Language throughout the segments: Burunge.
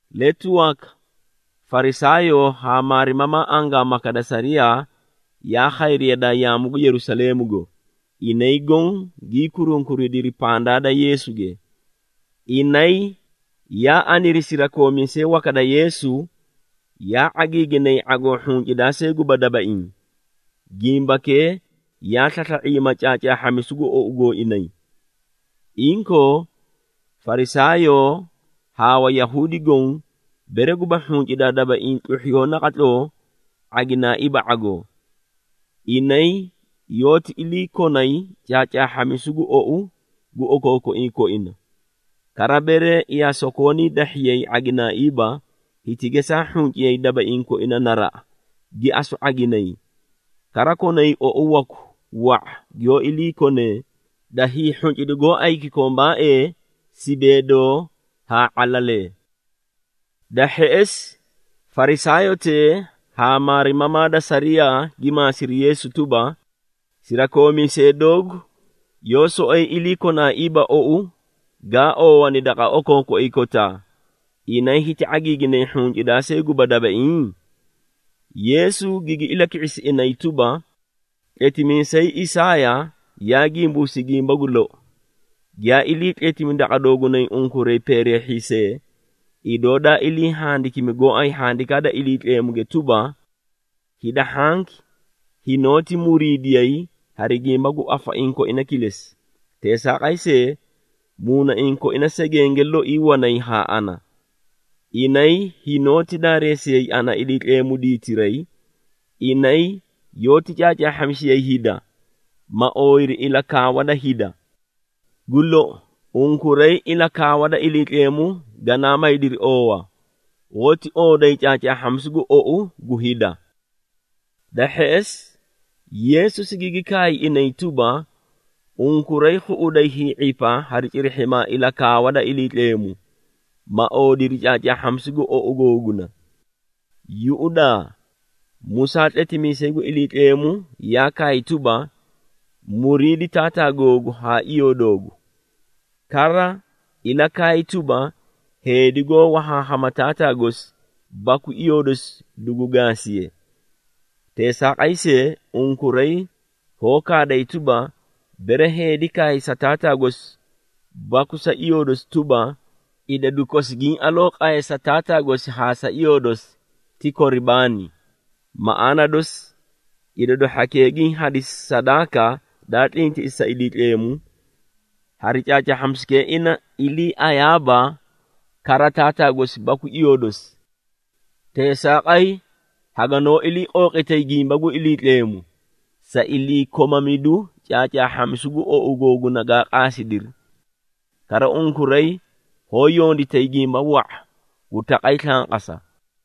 Letu waka, Farisaayoo haa maarimamaa angaamaka da sariyaa, yaa khayri yadaa yaamu gu Yerusaleemugo, inay goõ gii kurunkuridiri pandaa da Yeesuge. Inay yaa aniri sirakoomiisee waka da Yeesu, yaa ⁄agiiginay ⁄agoo hhuncidaa see guba dabaiĩ, gimbakee yaa slasla⁄iima caacaahhamisu gu ou gooinay. Inkoo, Farisaayoo haa Wayahuudi goõ, bere guba hhuncidaa dabaiĩ tluhhiya naqatloo ⁄aginaaiiba ⁄agoo. Inay yoóti iliikonay caacaahhamisu gu ou gu okookoiĩ koina. Kara bere yaa sokoonii dahhiyay ⁄aginaaiiba, hiti gesaa hhunciyay dabaiĩ koina naraꞌa, gi asu ⁄aginay. Kara konay ou waku wa⁄a giyoó iliikonee, da hiihhuncidu gooay kikombaae, sibeedoo haa ⁄alalee. Da hheꞌesi, Farisaayotee haa maarimamaa da sariyaa gi maasiri Yeesu tuba, “Sirakoomiisee doogu yoó soꞌoyi iliikonaaiiba ou gaa oowani daqa okookoiĩ kotaa, inay hiti ⁄agiiginay hhuncidaa see guba dabaiĩ?” Yeesu gigi ilaki⁄isi inay tuba, “Tletimiisay Isaaya yaa gimbuusi gimba gu lou, giyaa iliitletimi daqa doogunay unkuray peereehhiisee, idoo daa ilii handikimi gooay Handikaa da Iliitleemuge tuba, ‘Hida hhanki hinoóti muriidiyay hari gimba gu afaiĩ koina kilesi, teesaaqay see, muunaiĩ koina segenge loi wanay haa ana. Inay hinoóti daareesiyay ana Iliitleemu diitiray, inay yoóti caacaahhamisiyay hida, ma ooyiri ilakaawa da hida.’ Gu lou, unkuray ilakaawa da Iliitleemu ganaa maydiri oowa, hoóti ooday caacaahhamisu gu ou gu hida.” Da hheꞌesi, Yeesu sigigi kaay inay tuba, “Unkuray khuꞌuday hii⁄ipa hari cirihhimaa ilakaawa da Iliitleemu, ma oodiri caacaahhamisu gu ou googuna! Yuꞌudaa, Musaa tletimiisay gu Iliitleemu yaa kaay tuba, ‘Muriidi taataa googu haa iyoo doogu!’ Kara ilakaay tuba, ‘Heedi goó wahaahama taataa gosi baku iyoo dosi dugu gaasiye!’ Teesaaqay see, unkuray hoó kaaday tuba, bere heedi kaay sa taataa gosi baku sa iyoo dosi tuba, ‘Idadu kosi giĩ aloo qaye sa taataa gosi haa iyoo dosi ti Koribaani’ (maꞌaana dosi, idadu hhakee giĩ hadisi sadaaka daa tlintiꞌisi sa Iliitleemu), hari caacaahhamisukee ina iliiayaaba kara taataa gosi baku iyoo dosi. Teesaaqay haganoó ilii qooqitay gimba gu Iliitleemu, sa iliikomamidu caacaahhamisu gu ou googuna gaa qaasidiri. Kara unkuray hoó yonditay gimba wa⁄a gu taqay slanqasa.”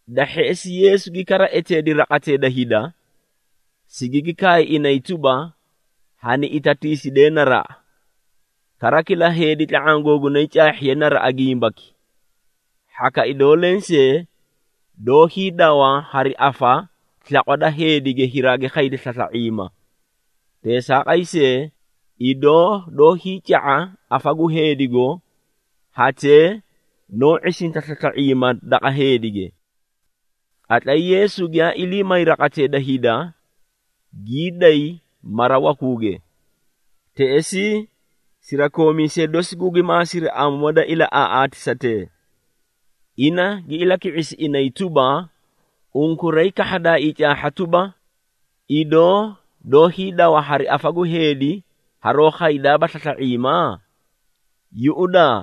Da hheꞌesi, Yeesu gi kara eteedi raqatee da hida, sigigi kaay inay tuba, “Hani itatiisidee naraꞌa, kara kila heedi tla⁄aã googunay caahhiye naraꞌa gimbaki. Hhaka idoo lensee doó hiidawa hari afa slaqwa da heedige hiraagi khayda slasla⁄iima. Teesaaqay see, idoo doó hiica⁄a afa gu heedigo, hatee noó ⁄isinta slasla⁄iima daqa heedige.” Qatlay Yeesu giyaa ilii may raqatee da hida, gii day mara wakuuge. Teꞌesii, sirakoomiisee dosi gugi maasiri amoo da ilaꞌaaꞌaatisatee. Ina gi ilaki⁄isi inay tuba, “Unkuray kahhadaaii caahha tuba, idoo doó hiidawa hari afa gu heedi haroó khaydaaba slasla⁄iima? Yuꞌudaa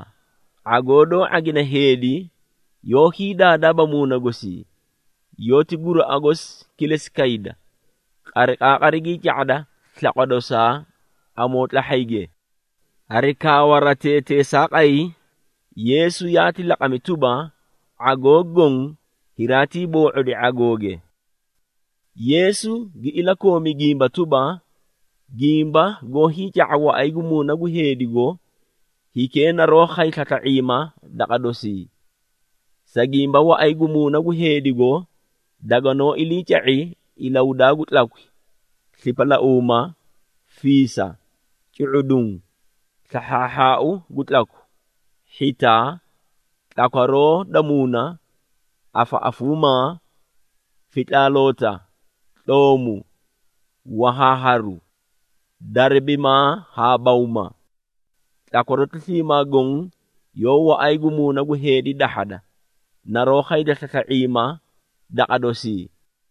⁄agoo doó ⁄agine heedi yoó hiidaadaaba muuna gosii, yoóti guraꞌa gosi kilesi kayda, qariqaaqari gii ca⁄ada slaqwa dosaa amootlahhayge!” Hari kaawaratee teesaaqay, Yeesu yaati laqami tuba, ⁄agoo goõ hiraatii boo⁄odi ⁄agooge. Yeesu gi ilakoomi gimba tuba, “Gimba goó hiica⁄a waꞌay gu muuna gu heedigo, hikee naroó khay slasla⁄iima daqa dosii. Sa gimba waꞌay gu muuna gu heedigo daganoó iliica⁄i ilahudaa gu tlakwi, slipalauuma, fiisa, cu⁄uduũ, slahhaahhaau gu tlaku, hhitaa, tlakwaroo da muuna, afaꞌafuumaa, fitlaaloota, tloomu, wahaaharu, darabimaa haa bawma. Tlakwaroti sliimaa goõ yoó waꞌay gu muuna gu heedi dahhada, naroó khayda slasla⁄iima daqa dosii.”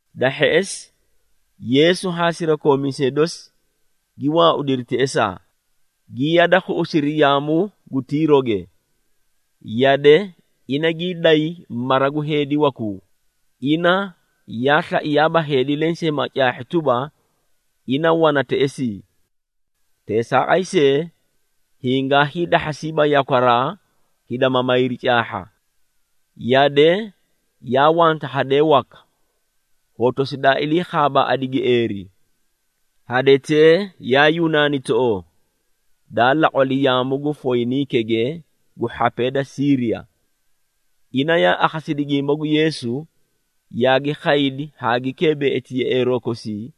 Da hheꞌesi, Yeesu haa sirakoomiisee dosi gi waaudiri teꞌesaa, gi yada khuꞌusiri yaamu gu Tiiroge. Yade ina gii day mara gu heedi wakuu, ina yaa slaiyaaba heedi lensee ma caahhi tuba, ina wana teꞌesii. Teesaaqay see, hingaa hiidahhasiiba yakwaraa, hida ma mayri caahha. Yade yaa wanta hadee waka, hotosi daa iliikhaabaꞌadi gieeri. Hadetee yaa Yunaanitoꞌoo, daa laqwali yaamu gu Foyiniikege gu hhapee da Siiriya. Ina yaa akhasidi gimba gu Yeesu, yaagi khaydi haa gi keebeꞌeti yeꞌeeroo kosii,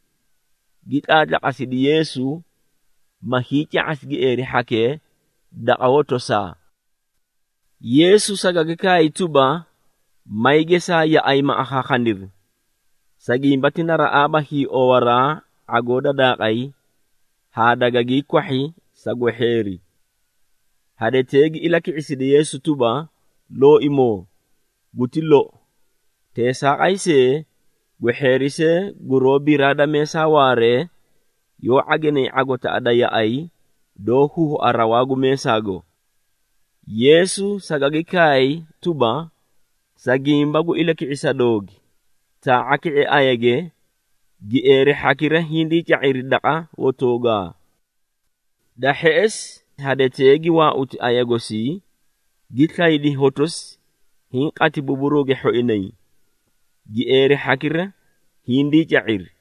gi tlaatlaqasidi Yeesu, ma hiica⁄asi gieeri hhakee daqa hotosaa. Yeesu sagagi kaay tuba, “May gesaa yaꞌay ma akhaakhaniri, sa gimba ti naraꞌaaba hiiowaraa ⁄agoo da daaqay, haa dagagii kwahhi sa gwehheeri.” Hadetee gi ilaki⁄isidi Yeesu tuba, “Looimoo, guti lou! Teesaaqay see, gwehheeri see guroó biraa da meesaa waaree, yoó ⁄aginay ⁄agotaꞌa da yaꞌay, doó huhua rawaa gu meesaago.” Yeesu sagagi kaay tuba, “Sa gimba gu ilaki⁄isa doogi, taa⁄a ki⁄e ayage, gieeri hhakira hindii ca⁄iri daqa hotoogaa.” Da hheꞌesi, hadetee gi waauti aya gosii, gi slaydi hotosi, hiĩ qati buburuuge hhoinay, gieeri hhakira hindii ca⁄iri.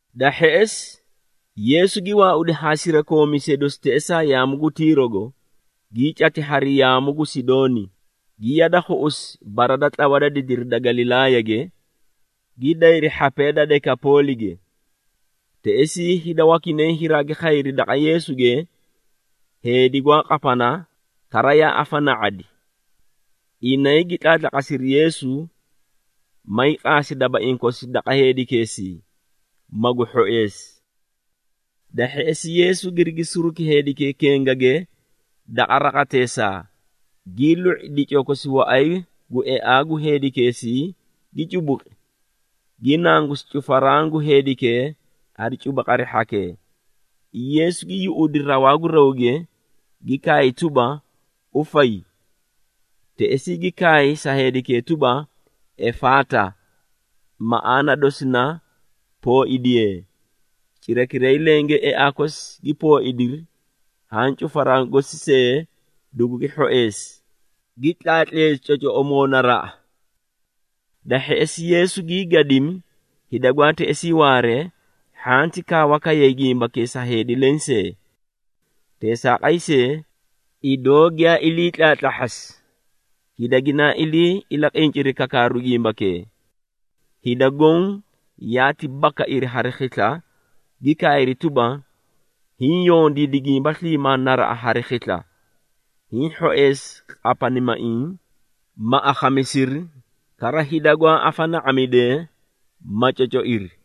Da hheꞌesi, Yeesu gi waaudi haa sirakoomiisee dosi teꞌesaa yaamu gu Tiirogo, gii cati hari yaamu gu Sidooni, gi yada khuꞌusi bara da tlawa da didiri da Galilaayage, gi dayri hhapee da Dekapoolige. Teꞌesii hida wakinay hiraagi khayri daqa Yeesuge, heedi gwaa qapana kara yaa afana⁄adi. Inay gi tlaatlaqasiri Yeesu, mayii qaasi dabaiĩ kosi daqa heedikeesii, magu hhoeesi. Da hheꞌesi, Yeesu girigi suruki heedikee kengage daqa raqateesaa, gii lu⁄i dicoo kosi waꞌay gu eaa gu heedikeesii, gii cubuqi, gi nangusi cufaraã gu heedikee hari cubuqari hhakee. Yeesu gi yuꞌudi rawaa gu rawge, gi kaay tuba, “Ufay!” Teꞌesii gi kaay sa heedikee tuba, “Efaata!” (maꞌaana dosi na “Pooidiyee!”). Cirakiray lenge eaa kosi gi pooidiri haã cufaraã gosi see dugugi hhoeesi, gi tlaatleesi cocoꞌomoo naraꞌa. Da hheꞌesi, Yeesu gii gadimi hida gwaa teꞌesii waaree, hhanti kaawa kayay gimbakee sa heedi lensee. Teesaaqay see, idoo giyaa ilii tlaatlahhasi, hida ginaa ilii ilaqinciri kakaaru gimbakee. Hida goõ yaati bakairi hari khisla, gi kaayri tuba, “Hiĩ yondiidi gimba sliimaa naraꞌa hari khisla! Hiĩ hhoeesi qapanimaiĩ, ma akhamisiri, kara hida gwaa afana⁄amidee, ma cocoiri.”